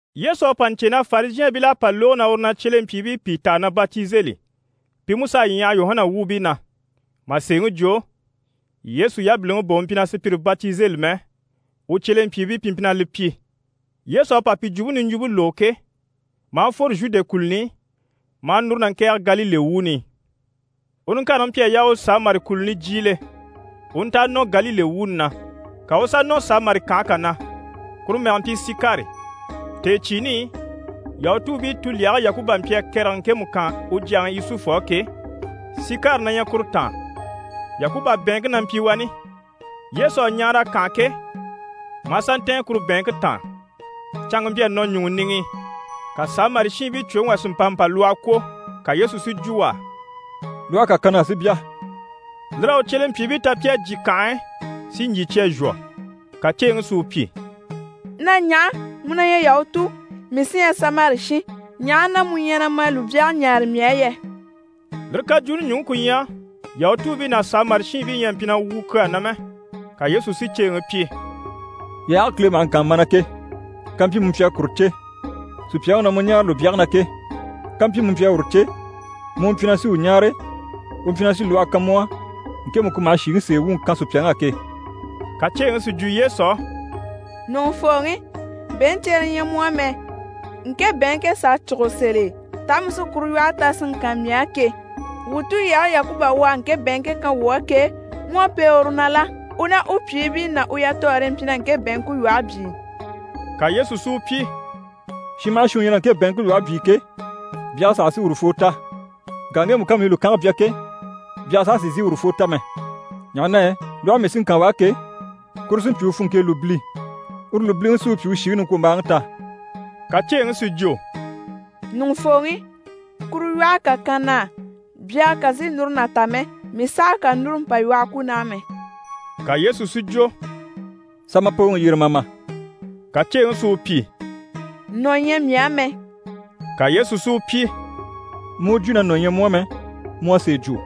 Yesu à pa ɲcè na Farizhɛɛnbil'à pa lógo na uru na cyelempyiibii pìi taa na batizeli, pi mú s'à ɲyaha Yuhana wuubii na. Mà sèeŋi jwo, Yesu yabiliŋi bà u mpyi na sùpyire batizeli mɛ, u cyelempyiibii pi mpyi na li pyi. Yesu à pa pi jwumpe niɲjwumpe lógo ke, maa fworo Zhude kùluni i maa núru na ŋkɛ̀ɛge Galile wuuni i. U niŋkareŋi mpyi a yaa u Samari kùluni jyiile, u u nta a nɔ Galile wuuni na. Ka u u sà nɔ Samari kànhe kà na, kuru mɛge mpyi Sikari. Tèecyiini i, Yahutuubii tulyage Yakuba mpyi a kɛrɛge ŋkemu kan u jyaŋi Yusufu á ke, Sikari na ɲyɛ kuru taan. Yakuba bɛ̀ɛnŋke na mpyi wani. Yesu à ɲaara a kànha ke, maa sà ntɛ̀ɛn kuru bɛ̀ɛnŋke taan. Canŋke mpyi a nɔ ɲùŋɔ niŋi i. Ka Samari shiinbii cwoŋi wà si mpa mpa lwɔhɔ kwó. Ka Yesu si jwo u á: «Lwɔhe kà kan na á, si bya.» Lir'à u cyelempyiibii ta pi à jyè kànhe e si ɲjyì cya zhwɔ. Ka ceeŋi si u pyi: «Na ɲaha? Mu na ɲyɛ Yahutu, mii sí ɲyɛ Samari shin, ɲaha na mu na ma lùbyage ɲáare mii á yɛ?» (Lire kajwuuni ɲùŋke ku ɲyɛ Yahutuubii ná Samari shiinbii ɲyɛ a mpyi na wwùu kyaa na mɛ.) Ka Yesu si ceeŋi pyi: «Yaage Kile maha ŋkaan mana ke, kàmpyi mu mpyi a kuru cè, sùpyaŋi u na mu ɲáare lùbyage na ke, kàmpyi mu mpyi a uru cè, mu u mpyi na sí u ɲáare, u mpyi na sí lwɔhɔ kan mu á, ŋkemu ku maha shìŋi sèe wuŋi kan sùpyaŋ'á ke.» Ka ceeŋi si jwo Yesu á: «Ɲùŋufooŋi, bɛ̀ɛnɲcere ɲyɛ mu á mɛ, ŋke bɛ̀ɛnŋke s'à cûgo sèl'e, taa mu sí kuru lwɔhe ta si ŋkan mii á ke? Wuu tulyage Yakuba u à ŋke bɛ̀ɛnŋke kan wuu á ke, mu à pêe uru na la? U ná u pyìibii ná u yatɔɔre mpyi na ŋke bɛ̀ɛnŋke lwɔhe byii.» Ka Yesu si u pyi: «Shin maha shin u ɲyɛ na ŋke bɛ̀ɛnŋke lwɔhe byii ke, byage saha sí urufoo ta. Ŋka ŋgemu ká mii lùkange bya ke, byage saha sì n‑sìi urufoo ta mɛ. Ɲaha na yɛ lwɔhe mii sí n‑kan u á ke, kuru sí n‑pyi u funŋke e lùbili. Uru lùbiliŋi sí u pyi u shìŋi niŋkwombaaŋi ta.» Ka ceeŋi si jwo: «Ɲùŋufooŋi, kuru lwɔhe kà kan na á, byage kà n‑sìi núru na ta mɛ, mii sàha kà núru mpa lwɔhɔ kwó naha mɛ.» Ka Yesu si jwo: «Sà ma pooŋi yyere, ma a ma.» Ka ceeŋi si u pyi: «Nɔ̀ ɲyɛ mii á mɛ.» Ka Yesu si u pyi: «Mu u jwo na nɔ̀ ɲyɛ mu á mɛ, mu à sèe jwo.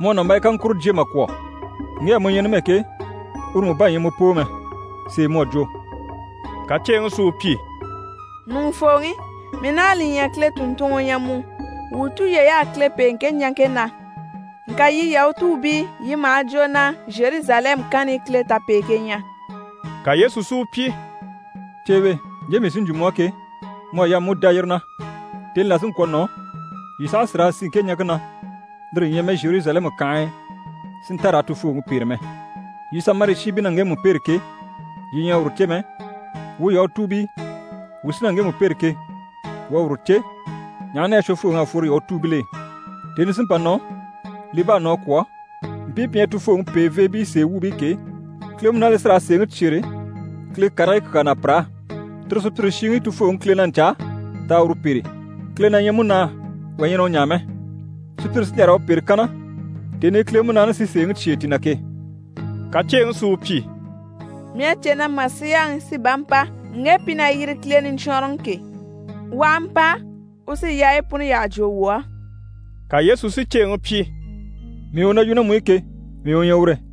Mu à nàmbaya kaŋkuro jyé mà kwɔ̀, ŋge á mu ɲyɛ numɛ ke, uru mú bá ɲyɛ mu poo mɛ. Sèe mu à jwo.» Ka ceeŋi si u pyi: «Ɲùŋufooŋi, mii naha li ɲya, Kile tùnntunŋɔ u ɲyɛ mu. Wuu tulyey'à Kile pêe ŋke ɲaŋke na, ŋka yii Yahutuubii, yii maha jwo na Zheruzalɛmu kanni i Kile tapeeŋke ɲyɛ.» Ka Yesu si u pyi: «Ceewe, ɲje mii sí n‑jwo mu á ke, mu à yaa mu u dá yire na, tèni là sí n‑kwɔ̀ nɔ, yii saha sì raa sì ŋke ɲaŋke na, lire ɲyɛ mɛ Zheruzalɛmu kànhe e si nta raa Tufooŋi pêre mɛ. Yii Samari shiinbii na ŋgemu pêre ke, yii ɲyɛ a uru cè mɛ, wuu Yahutuubii, wuu sí na ŋgemu pêre ke, wuu à uru cè, ɲaha na yɛ Shwofooŋi à fworo Yahutuubil'e. Tèni sí n‑pa nɔ, li bá à nɔ a kwɔ̀, mpii pi ɲyɛ Tufooŋi pèeveebii sèe wuubii ke, Kile Munaani li sí raa sèeŋi cyêre Kile karigii kyaa na pir'á. Tire sùpyire shiŋi Tufooŋi Kile na ɲcaa t'a uru pêre. Kile na ɲyɛ Munaa, wà ɲyɛ na u ɲaa mɛ. Sùpyire sí n‑jà raa u pêre kanna tèni i Kile Munaani sí sèeŋi cyêe ti na ke.» Ka ceeŋi si u pyi: «Mii à cè na Masiyaŋi sí bá n‑pa (ŋge pi na yiri Kile Niɲcwɔnrɔŋi ke). U aha mpa, u sí yaayi puni yyaha jwo wuu á.» Ka Yesu si ceeŋi pyi: «Mii u na yu ná mu i ke, mii u ɲyɛ ure.»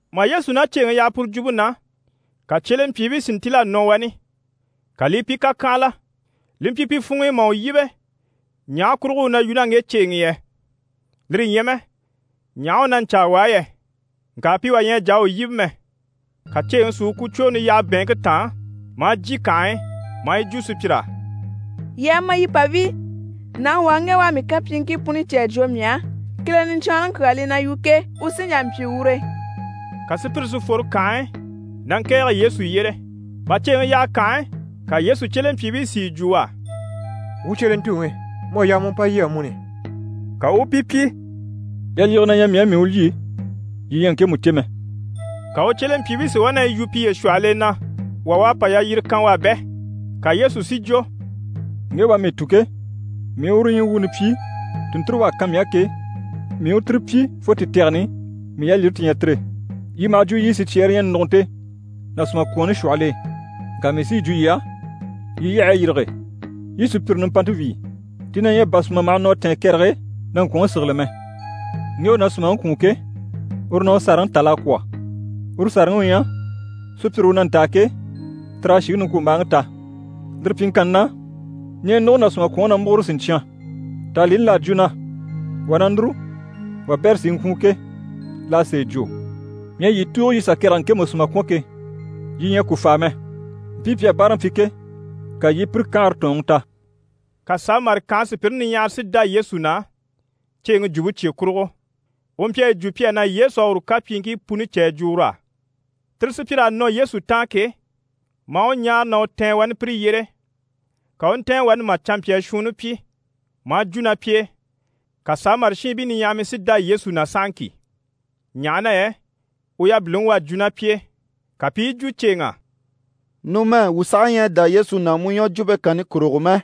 Mà Yesu ná ceeŋi yaha puru jwumpe na, ka cyelempyiibii si ntíl'a nɔ wani. Ka li i pi kàkyanhala. Li mpyi pi funŋ'i mà u yíbe ɲaha kurugo u na yu ná ŋge ceeŋi i yɛ, lire ɲyɛ mɛ ɲaha u na ɲcaa u á yɛ, ŋka pi wà ɲyɛ a jà a u yíbe mɛ. Ka ceeŋi si u kucwooni yaha bɛ̀ɛnŋke taan, maa jyè kànhe e, maa yi jwo sùpyir'á: «Yii a ma yii pa wíi. Nàŋi wà u ŋge u à mii kapyiiŋkii puni cè a jwo mii á. Kile Niɲcwɔnrɔŋi kyaa li na yu ke, u sí n‑jà n‑pyi ure.» Ka sùpyire si fworo kànhe e, na ŋkɛ̀ɛge Yesu yyére. Mà ceeŋi yaha kànhe e, ka Yesu cyelempyiibii si yi jwo u á: «Wuu cyelentuŋi, mu à yaa mu u mpa lyî amuni.» Ka u u pi pyi: «Yalyige na ɲyɛ mii á, mii u lyî, yii ɲyɛ a ŋkemu cè mɛ.» Ka u cyelempyiibii si wá na yi yu piye shwɔhɔl'e na wà u à pa yalyire kan u á bɛ? Ka Yesu si jwo: «Ŋge u à mii tun ke, mii u uru ɲyii wuuni pyi, tùnnture u à kan mii á ke, mii u tire pyi fo ti tɛgɛni, mii yalyire ti ɲyɛ tire. Yii maha jwo yiɲyɛ sicyɛɛre yi ɲyɛ nùgunte ná sùmakwɔɔnni shwɔhɔl'e. Ŋka mii sí yi jwo yii á, yii yyahayi yîrige, yii i sùpyire nimpante wíi. Ti na ɲyɛ bà sùma maha nɔ a tɛ̀ɛn kɛrɛge e, na ŋkwɔ̀nŋi sigili mɛ. Ŋge u na sùmaŋi kwùun ke, uru na u sàraŋi tal'a kwɔ̀. Uru sàraŋi u ɲyɛ: sùpyire u na ntaa ke, tir'à shìŋi niŋkwombaaŋi ta. Lire pyiŋkanni na, ɲɛɛnuguŋi ná sùmakwɔnŋi na múgure siɲcyan. Tàanlini l'à jwo na “Wà na núru, wabɛrɛ sí i ŋkwùun” ke, l'à sèe jwo. Mii à yii tùugo yii sà kɛrɛge ŋkemu sùma kwɔ̀n ke, yii ɲyɛ a ku fàa mɛ. Mpii pi à báaraŋi pyi ke, ka yii i pire kanhare tɔ̀ɔnŋi ta.» Ka Samari kànhe sùpyire niɲyahara si dá Yesu na, ceeŋi jwumpe cye kurugo, u mpyi a yi jwo pi á na Yesu à uru kapyiiŋkii puni cè a jwo ur'á. Tire sùpyir'à nɔ Yesu taan ke, maa u ɲáare na u tɛ̀ɛn wani pire yyére, ka u u ntɛ̀ɛn wani mà canmpyaa shuunni pyi, maa jwo ná pi e, ka Samari shiinbii niɲyahamii si dá Yesu na sahaŋki, ɲaha na yɛ u yabiliŋi u à jwo ná pi e. Ka pi i yi jwo ceeŋ'á: «Numɛ wuu saha ɲyɛ a dá Yesu na mu ɲwɔjwumpe kanni kurugo mɛ,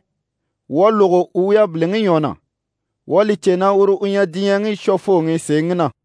wuu à lógo u yabiliŋi ɲwɔ na, wuu à li cè na uru u ɲyɛ diɲyɛŋi Shwofooŋi, sèeŋi na.»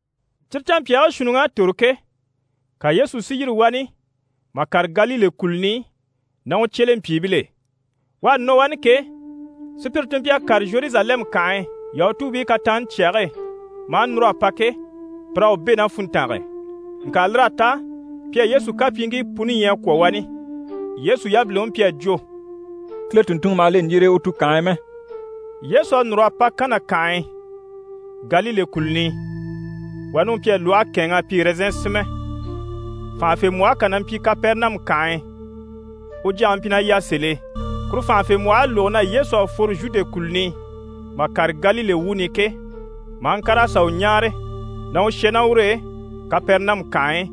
Cyire canmpyaagii shuunniŋ'à tòro ke, ka Yesu si yîri wani mà kàre Galile kùluni i ná u cyelempyiibil'e. U à nɔ wani ke, sùpyire ti mpyi a kàre Zheruzalɛmu kànhe e Yahutuubii kataanni cyage e, maa núr'a pa ke, pir'à u bɛ̂ ná funntange e, ŋka lir'à ta pi à Yesu kapyiiŋkii puni ɲya a kwɔ̀ wani. Yesu yabiliŋi mpyi a jwo: «Kile tùnntunŋɔ maha le ɲjire e u tukanhe e mɛ.» Yesu à núr'a pa Kana kànhe e, Galile kùluni i. Wani u mpyi a lwɔhe kɛ̂ɛnŋ'a pyi ɛrɛzɛn sinmɛ. Fànhafembwɔhe kà na mpyi Kapɛrɛnamu kànhe e, u jyaŋi mpyi na yà sèl'e. Kuru fànhafembwɔh'à lógo na Yesu à fworo Zhude kùluni i, mà kàre Galile wuuni i ke, maa ŋkàr'a sà u ɲáare na u shà ná ur'e Kapɛrɛnamu kànhe e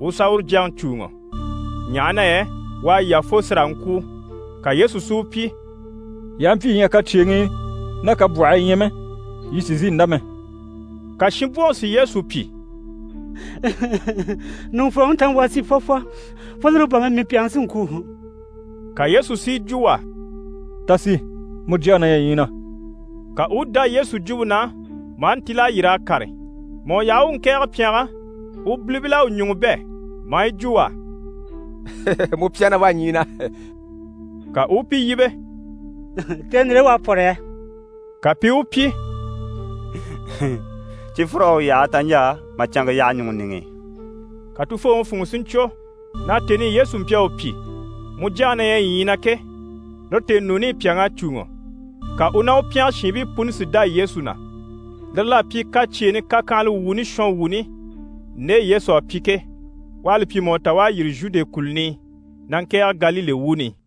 u sà uru jyaŋi cùuŋɔ, ɲaha na yɛ u à yà fo sí raa ŋkwûu. Ka Yesu si u pyi: «Yii aha mpyi yii ɲyɛ a kacyeeŋii ná kabwɔhii ɲya mɛ, yii sì n‑sìi n‑dá mɛ.» Ka shinbwoŋi si Yesu pyi: «Ɲùŋufooŋi, ta ma, wuu a sì fwɔfwɔ, fo lire bà mɛ, mii pyàŋi sí n‑kwû.» Ka Yesu si yi jwo u á: «Ta sì, mu jyaŋi na ɲyɛ ɲyii na.» Ka u u dá Yesu jwumpe na, maa ntíl'a yîr'a kàre. Mà u yaha u u ŋkɛ̀ɛge pyɛngɛ, u bilibil'à u ɲùŋɔ bɛ̂, maa yi jwo u á: «Mu pyàŋi na wá ɲyii na!» Ka u u pi yíbe: «Tèni ndire e u à pwɔ́rɔ yɛ?» Ka pi i u pyi: «Cifwur'à u yaha, taɲjaa mà canŋke yaha ɲùŋɔ niŋi i.» Ka tufooŋi funŋɔ si ɲcwo na tèni i Yesu mpyi a u pyi: «Mu jyaŋi na ɲyɛ ɲyii na» ke, lire tèenuuni i pyàŋ'à cùuŋɔ. Ka u ná u pyɛngɛ shiinbii puni si dá Yesu na. Lire l'à pyi kacyeeni kakyanhala wuuni shɔnwuuni nde Yesu à pyi ke, u à li pyi mà u ta u à yîri Zhude kùluni i na ŋkɛ̀ɛge Galile wuuni i.